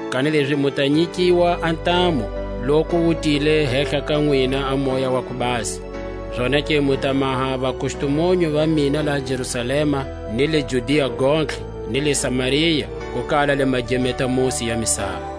Kanilezi mu ta nyikiwa a ntamu, loku wu tile hehla ka nwina a Moya wa ku Basa; zonake mu ta maha vakustumunyu va mina laha Jerusalema, ni le Judia gontlhe, ni le Samaria, ku kala le magemeta-musi ya misava. Jesu a tlakukela tilweni.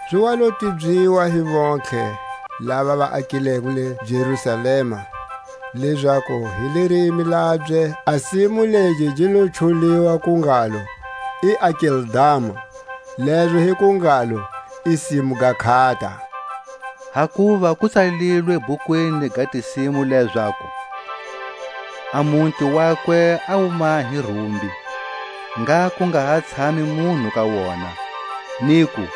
Zi wa lo tibyiwa hi vontlhe lava va akileko le Jerusalema, lezaku hi lirimi labye a simu legi gi lo chuliwa ku ngalo: I Akeldama; lezo hi ku ngalo: I simu ga nkhata. Hakuva ku tsalilwe bhukwini ga Tisimu lezaku: A muti wakwe a wu mahe rumbi, Ngha ku nga ha tshami munhu ka wona; niku: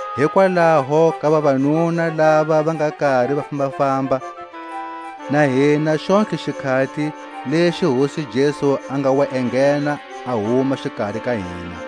Hikwalaho ka vavanuna lava va nga kari va fambafamba na hina xontlhe xikhati lexi Hosi Jesu a nga wa enghena a huma xikari ka hina,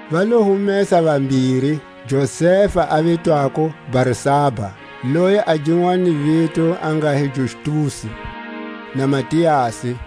Va lo humesa vambiri, Josefa a vitwako Barsaba, loyi a ginwani vito a nga hi Justusi, na Matiasi.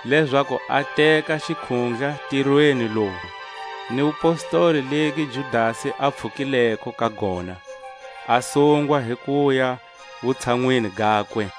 lezaku a teka xikhundla ntirweni lowu, ni wupostoli legi Judasi a pfhukileko ka gona, a sungwa hi kuya wutshanwini gakwe.